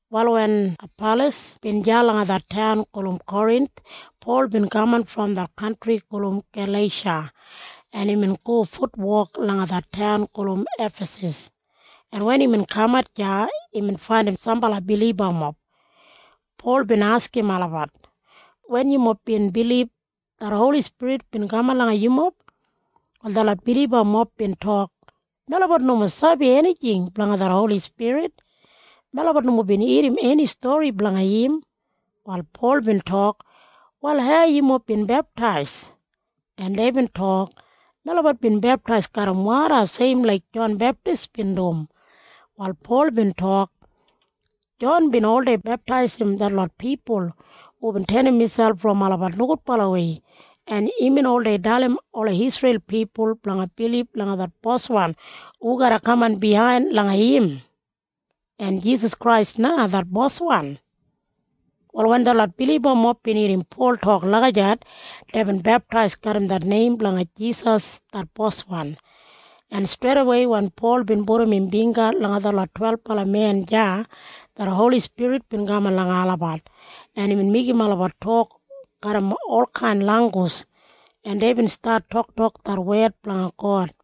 Wal wen Apalas bin deya langa det taun gulum Korinth, Pol bin kaman brom det kantri gulum Galeisha, en imbin go futwok langa det taun gulum Efasas, en wen imbin kamat deya, imbin faindim sambala bilibamob. Pol bin askim olabat, “Wen yumob bin bilib, det Holi Spirit bin kaman langa yumob?” Wal detlot bilibamob bin tok, “Melabat nomo sabi enijing blanga det Holi Spirit. Melabat nomo bin irrim eni stori blanga im.” Wal Pol bin tok, “Wal hau yumob bin beptais?” En deibin tok, “Melabat bin beptais garram woda seimwei laik Jon Beptis bin dum.” Wal Pol bin tok, “Jon bin oldei beptaisim detlot pipul hubin tenim miselp brom olabat nogudbalawei, en imbin oldei dalim ola Isreil pipul blanga bilib langa det Boswan hu garra kaman biyain langa im. En Jisas Krais na det Boswan.” Wal wen detlot bilibamob bin irrim Pol tok lagijat, deibin beptais garram det neim blanga Jisas det Boswan. En streidawei wen Pol bin pudum im bingga langa detlot twelbala men deya, det Holi Spirit bin kaman langa olabat, en imbin meigim olabat tok garram olkain langgus, en deibin stat toktok det wed blanga God.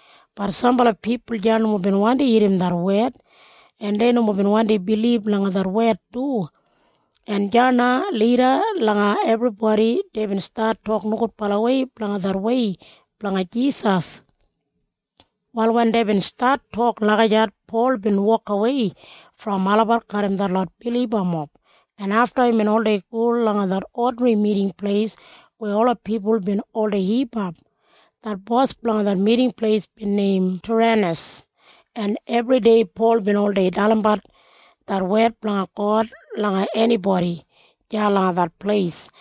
Bat sambala pipul deya nomo bin wandi irrim det wed, en dei nomo bin wandi bilib langa det wed du, en deya na lida langa ebribodi deibin stat tok nogudbalawei blanga det wei blanga Jisas. Wal wen deibin stat tok lagijat, Pol bin wokawei brom olabat garram detlot bilibamob, en afta imbin oldei go langa det odinri miting pleis weya ola pipul bin oldei hipap. Det bos blanga det miting pleis bin neim Tiranas, en ebridei Pol bin oldei dalimbat det wed blanga God langa enibodi deya langa det pleis.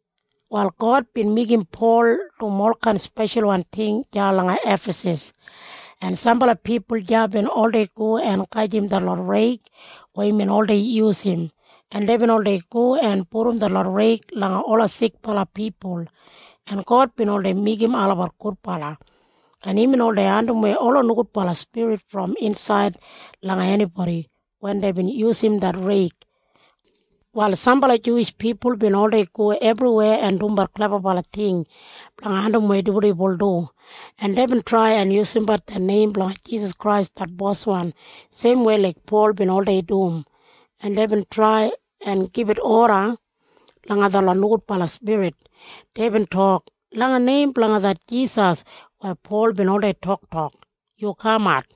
Wal God bin meigim Pol dum olkain speshalwan ting deya langa Efasas, en sambala pipul deya bin oldei go en gajim detlot reig weya imbin oldei yusum, en deibin oldei go en pudum detlot reig langa ola sikbala pipul, en God bin oldei meigim olabat gudbala, en imbin oldei andimwei ola nogudbala spirit brom insaid langa enibodi wen deibin yusum det reig. Wal sambala Juwish pipul bin oldei go ebriweya en dumbat klebabala ting blanga andimwei dibuldibul du, en deibin trai en yusumbat det neim blanga Jisas Krais det Boswan seimwei laik Pol bin oldei dum, en deibin trai en gibit oda langa detlot nogudbala spirit. Deibin tok, “Langa neim blanga det Jisas weya Pol oldei toktok, yu kamat.”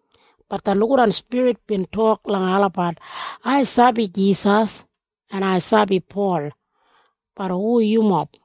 Bat det nogudwan spirit bin tok langa olabat, “Ai sabi Jisas, en ai sabi Pol. Bat hu yumob?”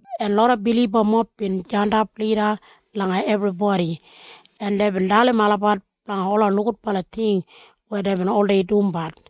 en loda bilibamob bin jandap lida langa ebribodi, en deibin dalim olabat blanga ola nogudbala ting weya deibin oldei dumbat,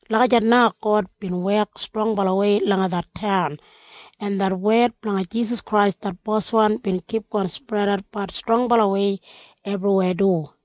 Lagijat na God bin wek strongbalawei langa det taun, en det wed blanga Jisas Krais det Boswan bin kipgon spredatbat strongbalawei ebriweya du.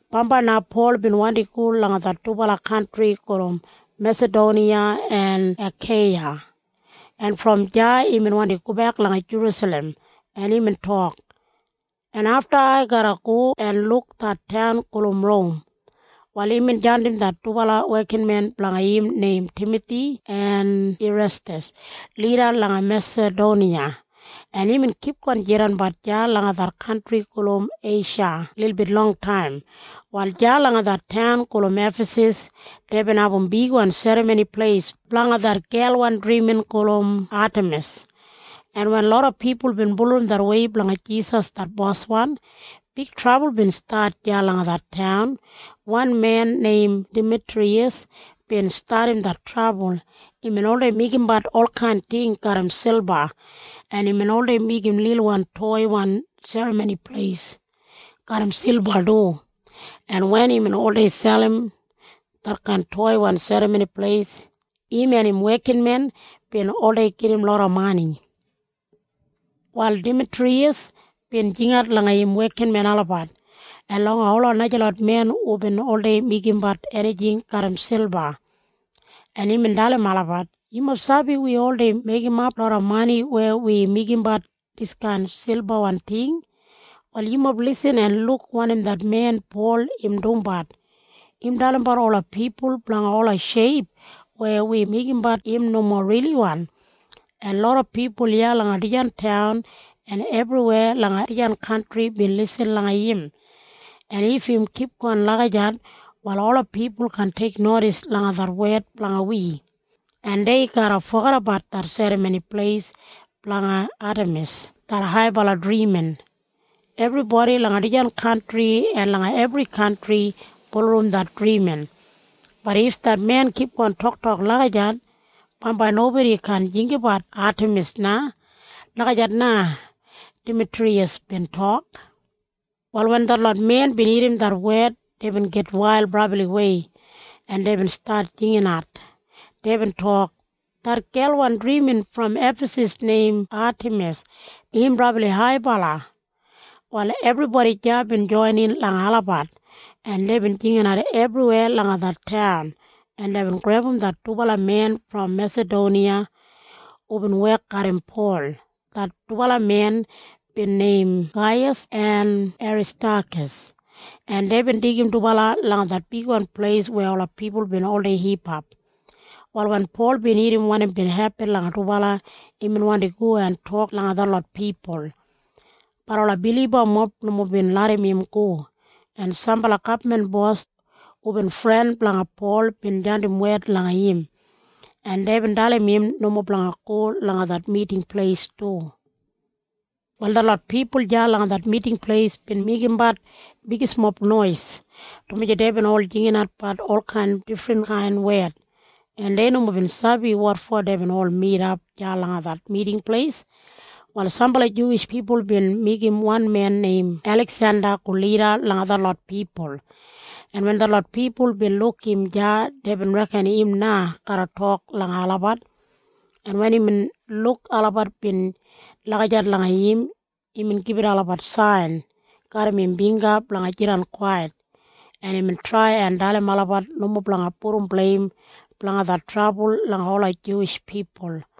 Bambai na Pol bin wandi go langa det dubala kantri gulum Mesadoniya en Akeiya, en brom deya imbin wandi gobek langa Jerusalem, en imbin tok, “En afta ai garra go en luk det taun gulum Rom.” Wal imbin jandim det dubala wekinmen blanga im neim Timathi en Irestas lida langa Mesadoniya, en imbin kipgon jidanbat deya langa det kantri gulum Eisha lilbit longtaim. Wal deya langa det taun gulum Efasas deibin abum bigwan serramoni pleis blanga det gelwan drimin gulum Atemis, en wen loda pipul bin bulurrum det wei blanga Jisas det Boswan, big trabul bin stat deya langa det taun. Wan men neim Damitriyas bin stadim det trabul. Imbin oldei meigimbat olkain ting garram silba, en imbin oldei meigim lilwan toiwan serramoni pleis garram silba du, en wen imbin oldei selim detkain toiwan serramoni pleis, im en im wekinmen bin oldei gedim loda mani. Wal Damitriyas bin jingat langa im wekinmen olabat en langa ola najalot men hubin oldei meigimbat enijing garram silba, en imbin dalim olabat, “Yumob sabi wi oldei meigimap loda mani weya wi meigimbat diskain silbawan ting. Wal yumob bin lisin en luk wanim det men neim Pol im dumbat. Im dalimbat ola pipul blanga ola sheip weya wi meigimbat im nomo riliwan, en loda pipul iya langa dijan taun en ebriweya langa dijan kantri bin lisin langa im. En if im kipgon lagijat, wal ola pipul kaan teiknodis langa det wek blanga wi, en dei garra fogedabat det serramoni pleis blanga Atemis det haibala drimin blanga wi. Ebribodi langa dijan kantri en langa ebri kantri bulurrum det drimin. Bat if det men kipgon toktok lagijat, bambai nobodi kaan jinggabat Atemis na.” Lagijat na Damitriyas bin tok. Wal wen detlot men bin irrim det wed, deibin gitwail brabliwei, en deibin stat jinginat. Deibin tok, “Det gelwan drimin brom Efasas neim Atemis im brabli haibala!” Wal ebribodi deya bin joinin langa olabat, en deibin jinginat ebriweya langa det taun, en deibin grebum det dubala men brom Mesadoniya hubin wek garram Pol. Det dubala men bin neim Gaiyas en Aristakas, en deibin deigim dubala langa det bigwan pleis weya ola pipul bin oldei hipap. Wal wen Pol bin irrim wanim bin hepin langa dubala, imbin wandi go en tok langa detlot pipul. Bat ola bilibamob nomo bin larram im go, en sambala gabman bos hubin fren blanga Pol bin jandim wed langa im, en deibin dalim im nomo blanga go langa det miting pleis du. Wal detlot pipul deya langa det miting pleis bin meigimbat bigismob nois, dumaji deibin ol jinginatbat olkain difrinkain wed, en dei nomo bin sabi wotfo deibin ol midap deya langa det miting pleis. Wal sambala Juwish pipul bin meigim wan men neim Eliksenda go lida langa detlot pipul, en wen detlot pipul bin luk im deya, deibin reken im na garra tok langa olabat, en wen imbin luk olabat bin lagijat langa im, imbin gibit olabat sain garram im bingga blanga jidan kwait, en imbin trai en dalim olabat nomo blanga pudum bleim blanga det trabul langa ola Juwish pipul.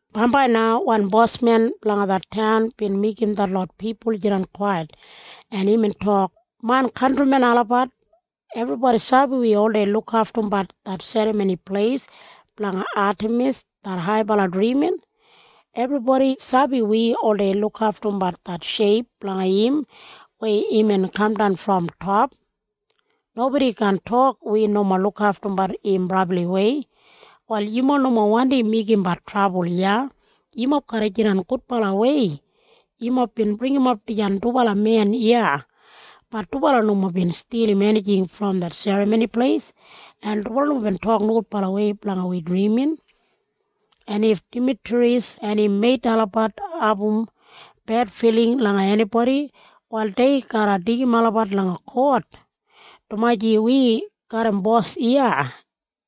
Bambai na wan bosmen blanga det taun bin meigim detlot pipul jidan kwait, en imbin tok, “Main kantrimen olabat, ebribodi sabi wi oldei lukaftumbat det serramoni pleis blanga Atemis det haibala drimin. Ebribodi sabi wi oldei lukaftumbat det sheip blanga im weya imbin kamdan brom top. Nobodi kaan tok wi nomo lukaftumbat im brabliwei. Wal yumob nomo wandi meigimbat trabul iya. Yumob garra jidan gudbalawei. Yumob bin bringimap dijan dubala men iya. Bat dubala nomo bin stilim enijing brom det serramoni pleis, en dubala nomo bin tok nogudbalawei blanga wi drimin. En if Damitriyas en im meit olabat abum bedfiling langa enibodi, wal dei garra deigim olabat langa kot, dumaji wi garram bos iya,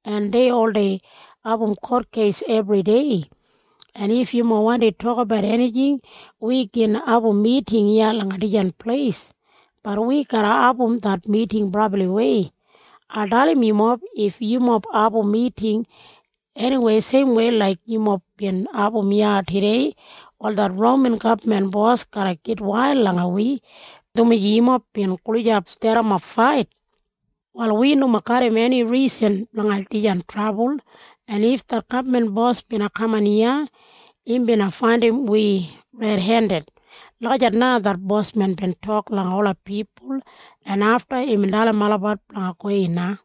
en dei oldei abum kotkeis ebridei. En if yumob wandi tokabat enijing, wi gin abum miting iya langa dijan pleis. Bat wi garra abum det miting brabliwei. Ai dalim yumob. If yumob abum miting eniwei seimwei laik yumob bin abum iya tudei, wal det Roman gabman bos garra gitwail langa wi, dumaji yumob bin gulijap stadimap fait. Wal wi nomo garram eni risan blanga dijan trabul, en if det gabman bos bina kaman iya, im bina faindim wi redendid.” Lagijat na det bosmen bin tok langa ola pipul, en afta imbin dalim olabat blanga gowei na.